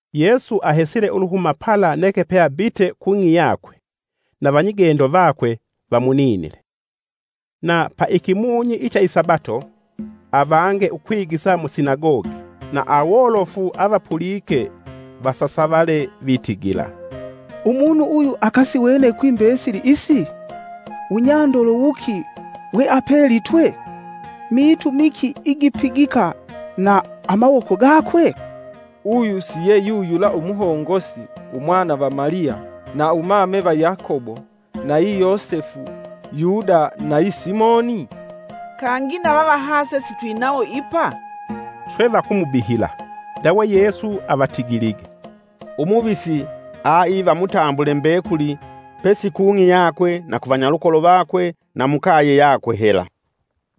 Yesu ahesile uluhuma pala neke peabite kung'i yakwe, na vanyigendo vakwe vamuninile. Na paikimunyi icha isabato avange ukwigisa musinagogi, na awolofu avapulike vasasavale vitigila, “Umunu uyu akasiwene kwi mbesili isi? Wunyandolo wuki we apelitwe? miitu miki igi igipigika na amawoko gakwe? Uyu si yeyuyula umuhongosi, Umwana va Maliya, na Umame va Yakobo, nayi Yosefu, Yuda nayi Simoni? Kangi na vavahase sitwinawo ipa?” Swe vakumubihila. Ndawe Yesu avatigilige, “Umuvisi aiva mutambule mbekuli pesi kung'i yakwe na ku vanyalukolo vakwe na mukaye yakwe hela.”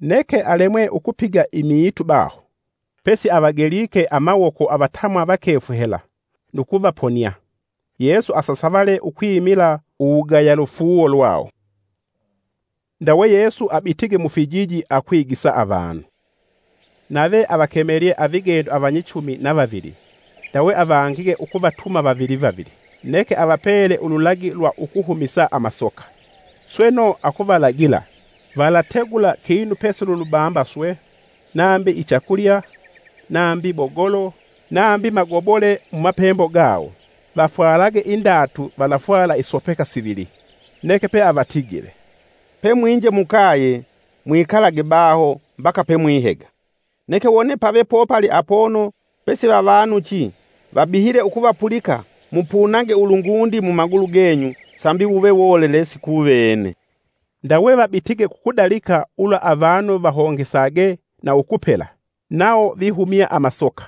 Neke alemwe ukupiga imiitu baho, pesi avagelike amawoko avatamwa vakefu hela, nu kuvaponia. Yesu asasavale ukwimila uwugaya lufuuwo lwawo. Ndawe Yesu abitige mufijiji akwigisa avanu. Nave avakemelye avigendo avanyichumi na vavili ndawe avangige ukuvatuma vavili vavili. Neke avapele ululagi lwa ukuhumisa amasoka, sweno akuvalagila, “Valategula kinu pesi lulubamba swe, nambi ichakulya nambi bogolo, nambi magobole mumapembo gawo. Vafwalage indatu valafwala isopeka sivili.” Neke peavatigile, “Pe mwinje mukaye, mwikalage baho mbaka pe mwihega. Neke wone pave popali apono pesivavanuchi, vabihile ukuvapulika mupunage ulungundi mumagulu genyu sambi wuve wolelesi kuvene.” Ndawe vabitige kukudalika ulwa avanu vahongesage na ukupela. Nawo vihumya amasoka;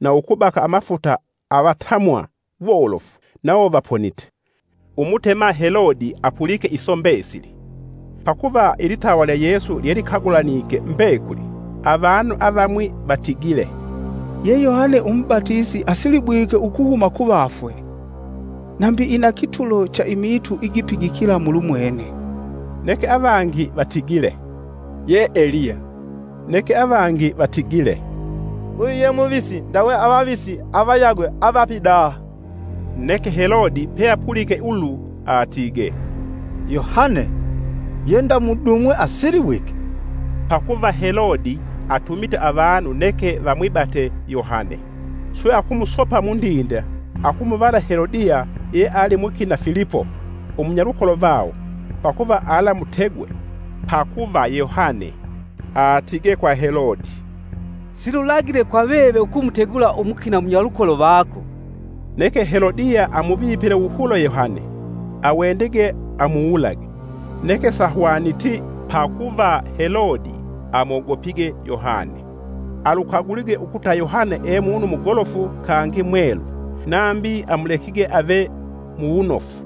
na ukubaka amafuta avatamwa wolofu, nawo vaponite. Umutema Helode apulike iso mbesili, pakuva ilitawa lya Yesu lyelikagulanike mbekuli. Avanu avamwi vatigile, “Ye Yohane umubatisi asilibwike ukuhuma kuvafwe, nambi inakitulo cha imiitu igipigikila mulumwene.” Neke avangi vatigile, “Ye Eliya.” Neke avangi vatigile, “Uyu ye muvisi, ndawe avavisi avayagwe avapidaha.” Neke Helode peapulike ulu atigee, “Yohane! Ye ndamudumwe asilibwike.” Pakuva Helode atumite avanu neke vamwibate Yohane, swe akumusopa mundinde akumuvala Helodiya ye ali mukina Filipo umunyalukolo vawo, pakuva alamutegwe. Pakuva Yohane atigee kwa Helode, “Silulagile kwa veve ukumutegula umukina munyalukolo vako.” Neke Helodiya amuvipile wuhulo Yohane, awendige amuwulage. Neke sahwaniti, pakuva Helode amwogopige Yohane, alukagulige ukuta Yohane e munu mugolofu kangi mwelu, nambi amulekige ave muwunofu.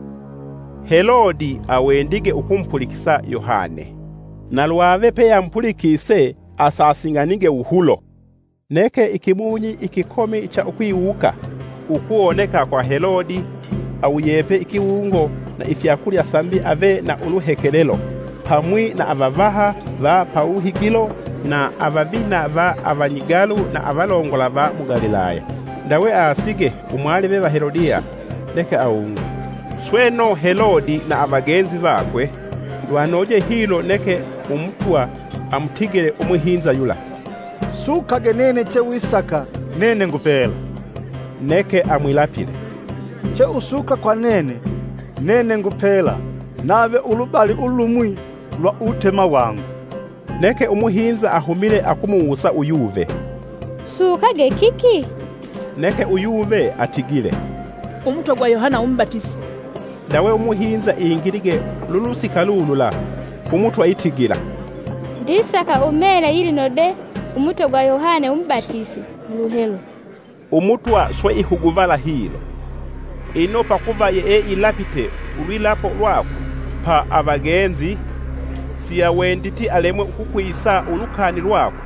Helode awendige ukumupulikisa Yohane, na lwave peyeamupulikise asasing'anige wuhulo. Neke ikimunyi ikikomi cha ukwiwuka ukuwoneka kwa Helode awuyepe ikiwungo na ifyakulya sambi ave na uluhekelelo pamwi na avavaha va pawuhigilo na avavina va avanyigalu na avalongola va mu Galilaya. Ndawe aasige umwalive va Helodiya neke awunge, sweno Helode na avagenzi vakwe lwanoje hilo neke umutwa amutigile umuhinza yula, “Sukage nene che wisaka, nene ngupela.” Neke amwilapile, “Che usuka kwa nene, nene ngupela; nave ulubali ulumwi lwa uwutema wangu.” Neke umuhinza ahumile akumuwusa uyuve, “Sukage kiki?” Neke uyuve atigile, “Umutwe gwa Yohane umubatisi.” Ndawe umuhinza ingilige lulusika lulula ku mutwa itigila, “Ndisaka umele yilinode umutwe gwa Yohane umubatisi muluhelo.” Umutwa swe ihuguvala hilo, ino pakuva yeeilapite ulwilapo lwakwe pa avagenzi siawenditi alemwe ukukwisa ulukani lwakwe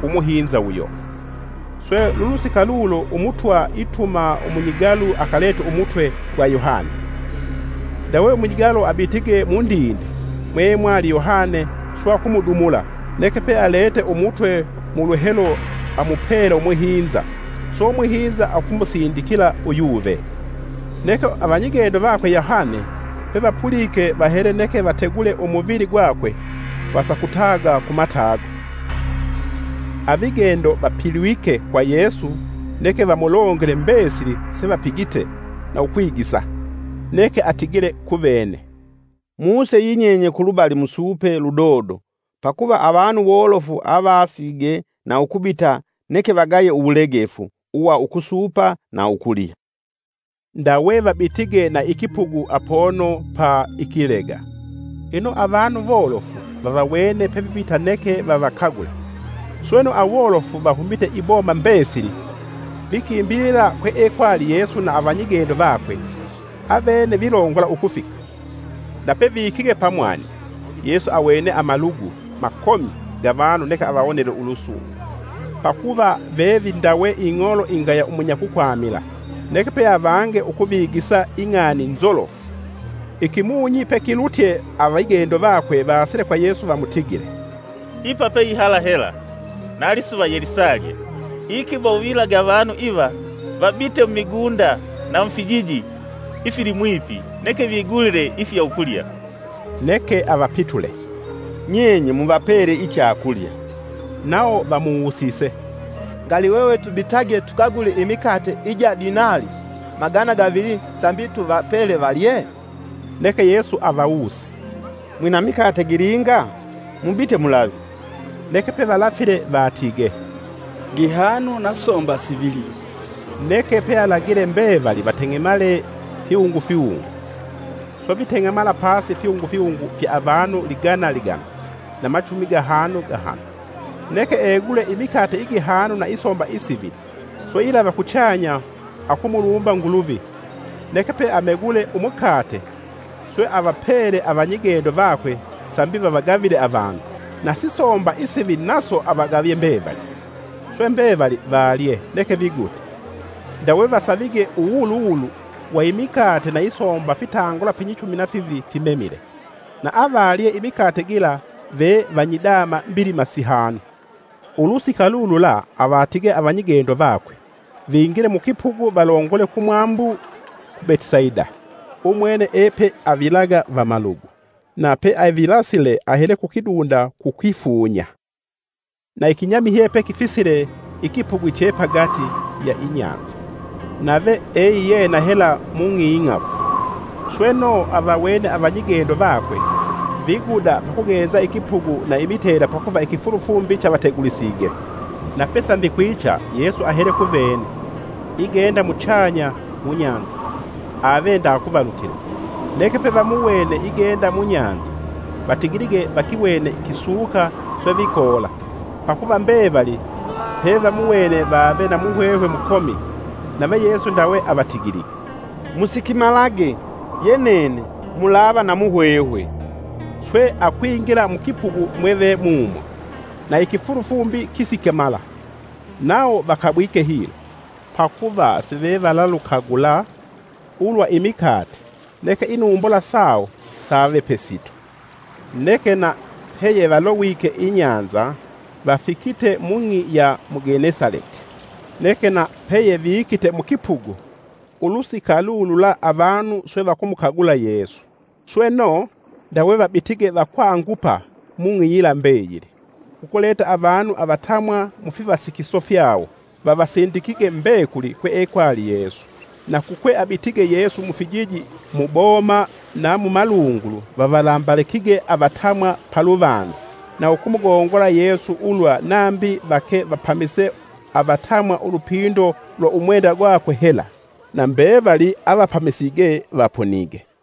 ku muhinza uyo. Swe lulusika lulo umutwa ituma umunyigalu akalete umutwe gwa Yohane. Ndawe umunyigalu abitige mundinde mweemwali Yohane swe akumudumula, neke pealete umutwe muluhelo amupele umuhinza, swe umuhinza akumusindikila uyuve. Neke avanyigendo vakwe Yohane pevapulike vahele neke vategule umuvili gwakwe vasakutaga ku matago. Avigendo vapilwike kwa Yesu neke vamulongele mbesili sevapigite na ukwigisa. Neke atigile kuvene, “Muse yinyenye kulubali musuupe ludodo pakuva avanu wolofu aavasige nu ukubita neke vagaye uwulegefu uwa ukusuupa na ukulya.” Ndawe vabitige na ikipugu apono pa ikilega. Ino avanu wolofu vavawene pevibita neke vavakagule. Sweno awolofu vahumite iboma mbesili, vikimbilila kweekwali Yesu na avanyigendo vakwe, avene vilongola ukufika. Nape vikige pamwani Yesu awene amalugu makomi ga vanu neke avawonele ulusungu, pakuva vevindawe ing'olo ingaya umunyakukwamila. Neke peavange ukuvigisa ing'ani nzolofu. Ikimunyi pekilutye avigendo vakwe vaasile kwa Yesu vamutigile, “Ipa pe ihala hela na lisuva yelisalye. Ikiba uvilage avanu iva, vabite mumigunda na mufijiji ifilimwipi neke vigulile ifya ukulya.” Neke avapitule, “Nyenye muvapele ichakulya.” Nawo vamuwusise, “Ngali hwehwe tubitage tukagule imikate ija dinali magana gavili sambi tuvapele valye?” Neke Yesu avawuse, “Mwina mikate gilinga? Mubite mulave.” Neke pevalafile vatigee, “Gihanu na somba sivili.” Neke pealagile mbevali vateng'emale fiwungu fiwungu Swe viteng'emala pasi fiwungu fiwungu fya avanu ligana ligana na machumi gahanu gahanu. Neke egule imikate igihanu na isomba isivili swe ilava kuchanya akumulumba Nguluvi, neke pe amegule umukate, swe avapele avanyigendo vakwe sambi vavagavile avanu. Na sisomba isivili naso avagavie mbevali. Swe mbevali valye, neke vigute. Ndawe vasavige uwuwuluwulu wa imikate na isomba fitangula finyichumi na fivili fimemile. Na avalye imikate gila ve vanyidama mbilima sihanu. Ulusika lulula avatige avanyigendo vakwe vingile mukipugu valongole kumwambu ku Betisaida, umwene epeavilaga vamalugu. Na peavilasile ahele kukidunda kukwifunya. Na ikinyamihye pekifisile ikipugu che pagati ya inyanza, nave eiyena hela mung'i ing'afu. Sweno, avawene avanyigendo vakwe viguda pakugenza ikipugu na imitela pakuva ikifulufumbi chevategulisige. Na pembe kwicha, Yesu ahele kuvene, igenda muchanya mu nyanza. Ave ndaakuvalutila, neke pevamuwene igenda munyanza vatigilige vakiwene kisuka swe vikoola; pakuva mbevali pevamuwene vave na muhwehwe mukomi. Nave Yesu ndawe avatigilige, “Musikimalage, ye nene. Mulava na muhwehwe!” Swe akwingila mukipugu, mwevemumo, na ikifulufumbi kisikimala. Nawo vakabwike hilo, pakuva sivevalalukagula ulwa imikate, neke inumbula sawo save pesito. Neke na peyevalowike inyanza, vafikite mung'i ya mu Genesaleti. Neke na peyevikite mukipugu, ulusika lulula avanu swe vakumukagula Yesu. Sweno, ndawe vabitige vakwangupa mung'i yila mbeyili, kukuleta avanu avatamwa mufivasikiso fyawo, vavasindikige mbekuli kweekwali Yesu. Na kukweabitige Yesu mufijiji, muboma, na mu malungulu vavalambalikige avatamwa paluvanza, na ukumugongola Yesu ulwa nambi vake vapamise avatamwa ulupindo lwa umwenda gwakwe hela. Na mbevali avapamisige vaponige.